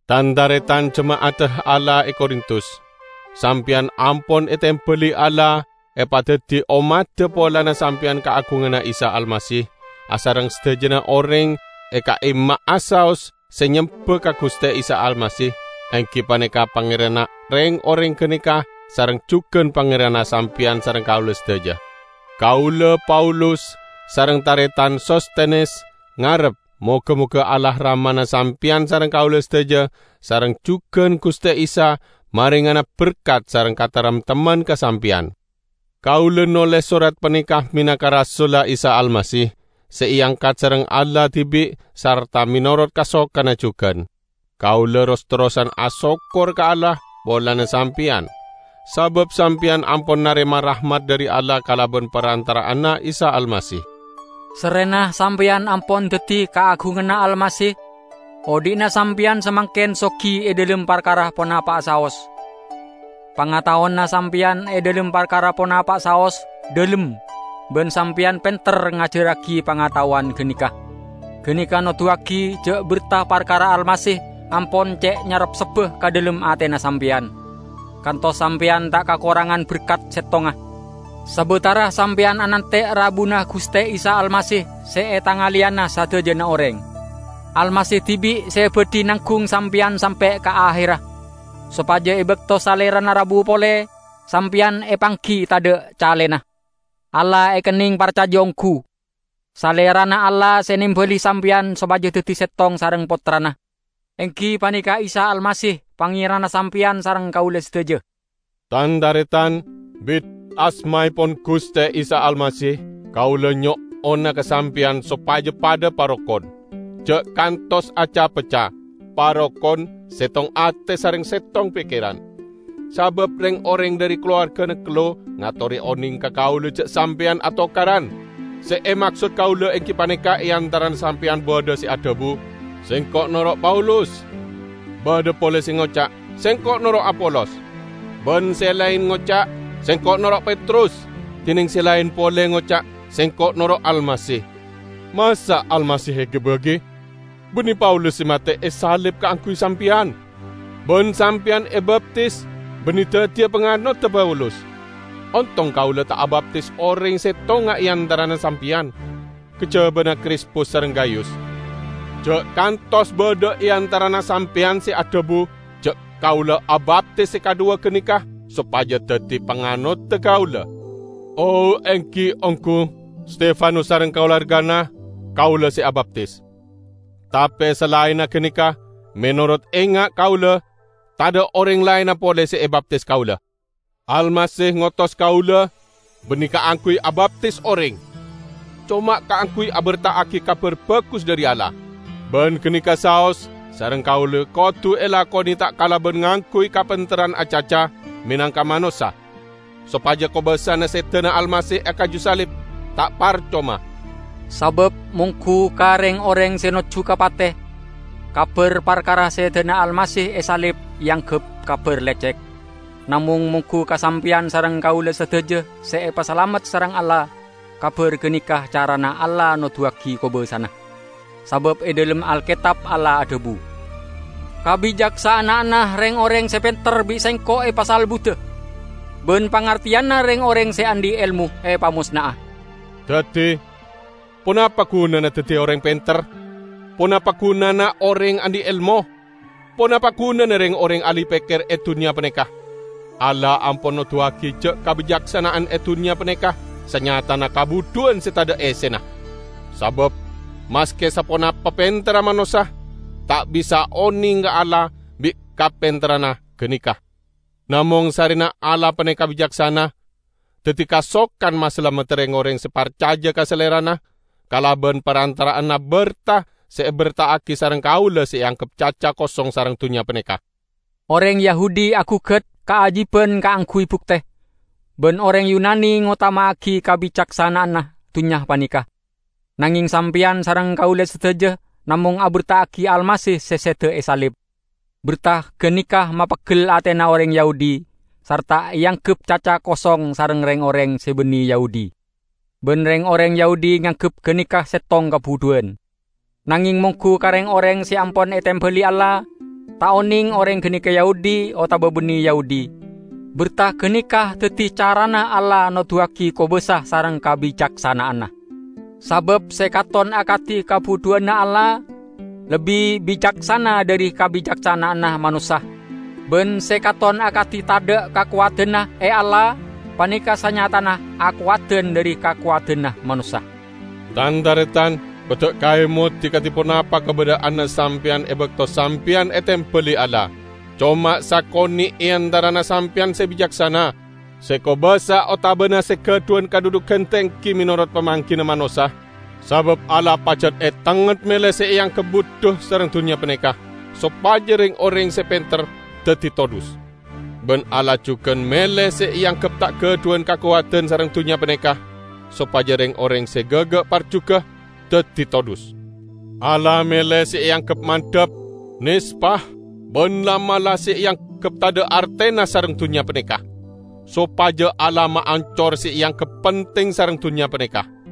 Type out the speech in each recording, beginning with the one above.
Tan-taretan jema'adda Allah e Korintus! Sampeyan ampon etembali Allah epadaddi ommadda polana sampeyan kaagunganna Isa Almasih, asareng sadajana oreng e ka'imma'a saos se nyemba ka Guste Isa Almasih, enggi paneka Pangeranna reng-oreng ganeka sareng jugan Pangeranna sampeyan sareng kaula sadaja. Kaula, Paulus, sareng taretan Sostenes, ngarep moga-moga Allah Ramana sampeyan sareng kaula sadaja sareng jugan Guste Isa marengana berkat sareng kataremtemman ka sampeyan. Kaula noles sorat paneka menangka rasulla Isa Almasih, se eangkat sareng Allah dibi' sarta menorot kasokanna jugan. Kaula ros-terrosan asokkor ka Allah polana sampeyan, sabab sampeyan ampon narema rahmat dhari Allah kalaban parantara'anna Isa Almasih. Sarrena sampeyan ampon daddi kaagunganna Almasih, odhi'na sampeyan samangken sogi e dhalem parkara ponapa'a saos. Pangataowanna sampeyan e dhalem parkara ponapa'a saos dhalem, ban sampeyan penter ngajarragi pangataowan ganeka. Ganeka noduwagi ja' berta parkara Almasih ampon ce' nyarepsebba ka dhalem atena sampeyan, kantos sampeyan ta' kakorangan berkat settonga, sabatara sampeyan anante' rabuna Guste Isa Almasih se etangaleyana sadajana oreng. Almasih dibi' se badhi nanggung sampeyan sampe' ka aherra; sopaja e bakto Salerana rabu pole, sampeyan epanggi, tadha' calena. Allah ekenneng parcaja onggu. Salerana Allah se nembali sampeyan sopaja daddi settong sareng Pottrana, enggi paneka Isa Almasih, Pangeranna sampeyan sareng kaula sadaja. Tan-taretan! Bit asmaepon Guste Isa Almasih, kaula nyo'ona ka sampeyan sopaja padha parokon, ja' kantos aca-pecca. Parokon, settong ate sareng settong pekkeran. Sabab reng-oreng dhari kalowargana Klo"e ngatore oneng ka kaula ja' sampeyan atokaran. Se emaksod kaula enggi paneka e antarana sampeyan badha se adhabu, "Sengko' noro' Paulus," badha pole se ngoca', "Sengko' noro' Apolos," ban se laen ngoca', "Sengko' noro' Petrus," dineng se laen pole ngoca', "Sengko' noro' Almasih." Masa' Almasih egi-bagi! Banne Paulus se mate esalib kaangguy sampeyan. Ban sampeyan ebaptis banne daddiya panganodda Paulus. Ontong kaula ta' abaptis oreng settonga e antarana sampeyan, kajabana Krispus sareng Gayus. Ja' kantos badha e antarana sampeyan se adhabu ja' kaula abaptis se kadhuwa ganeka sopaja daddi panganodda kaula. ( O, enggi, onggu, Stefanus sareng kalowargana kaula se abaptis. Tape, salaenna ganeka, menorot enga' kaula, tadha' oreng laenna pole se ebaptis kaula.) Almasih ngotos kaula banne kaangguy abaptis oreng, coma kaangguy aberta'agi Kabar Bagus dhari Allah; ban ganeka saos sareng kaula kodu elakone ta' kalaban ngangguy kapenterran acaca menangka manossa, sopaja kobasana sedana Almasih e kaju salib ta' parcoma. Sabab monggu ka reng-oreng se nojju ka pate, kabar parkara sedana Almasih e salib eanggep kabar lecek. Namong, monggu ka sampeyan sareng kaula sadaja se epasalamet sareng Allah, kabar ganeka carana Allah noduwagi kobasana. Sabab e dhalem Alketab Allah adhabu, "Kabicaksana'anna reng-oreng se penter bi' Sengko' epasalbuda, ban pangarteyanna reng-oreng se andhi' elmo epamosna'a." Daddi, ponapa gunana daddi oreng penter? Ponapa gunana oreng andhi' elmo? Ponapa gunana reng-oreng ahli pekker e dunnya paneka? Allah ampon noduwagi ja' kabicaksana'an e dunnya paneka sanyatana kabudhuwan se tadha' essena! Sabab maske saponapa penterra manossa, ta' bisa oneng ka Allah bi' kapenterranna ganeka. Namong sarrena Allah paneka bicaksana, daddi kasokan masalamedda reng-oreng se parcaja ka Salerana kalaban parantara'anna berta se eberta'agi sareng kaula se eanggep caca kosong sareng dunnya paneka. Oreng Yahudi agugat kaajiban kaangguy bukte, ban oreng Yunani ngotama'agi kabicaksana'anna dunnya paneka. Nangeng sampeyan sareng kaula sadaja namong aberta'agi Almasih se seda e salib. Berta ganeka mapeggel atena oreng Yahudi, sarta eanggep caca kosong sareng reng-oreng se banne Yahudi. Ban reng-oreng Yahudi nganggep ganeka settong kabudhuwan. Nangeng monggu ka reng-oreng se ampon etembali Allah -- ta' oneng oreng ganeka Yahudi otaba banne Yahudi -- berta ganeka daddi carana Allah noduwagi kobasa sareng kabicaksana'anna. Sabab se katon akadi kabudhuwanna Allah, lebbi bicaksana dhari kabicaksana'anna manossa; ban se katon akadi tadha' kakowadanna e Allah paneka sanyatana akowadan dhari kakowadanna manossa. Tan-taretan! Kodda' kaemodi kadi ponapa kabadha'anna sampeyan e bakto sampeyan etembali Allah. Coma sakone' e antarana sampeyan se bicaksana, se kobasa otabana se gadhuwan kadhudhugan tenggi menorot pamanggina manossa. Sabab Allah pajat etengnget mele se eanggep budhu sareng dunnya paneka, sopaja reng-oreng se penter daddi todhus. Ban Allah jugan mele se eanggep ta' gadhuwan kakowadan sareng dunnya paneka, sopaja reng-oreng se gaga' parjuga daddi todhus. Allah mele se eanggep mandhap, nespa, ban la'-mala' se eanggep tadha' artena sareng dunnya paneka, sopaja Allah maancor se eanggep penting sareng dunnya paneka.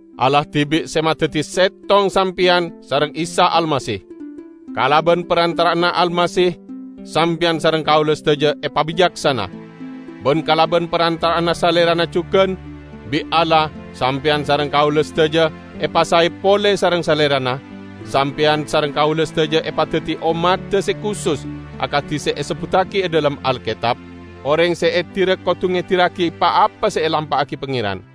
Allah dibi' se madaddi settong sampeyan sareng Isa Almasih. Kalaban parantara'anna Almasih sampeyan sareng kaula sadaja epabicaksana. Ban kalaban parantara'anna Salerana jugan bi' Allah sampeyan sareng kaula sadaja epasae pole sareng Salerana, sampeyan sareng kaula sadaja epadaddi ommadda se kusus akadi se esebbuttagi e dhalem Alketab, "Oreng se edira kodu ngedirragi pa-apa se elampa'agi Pangeran."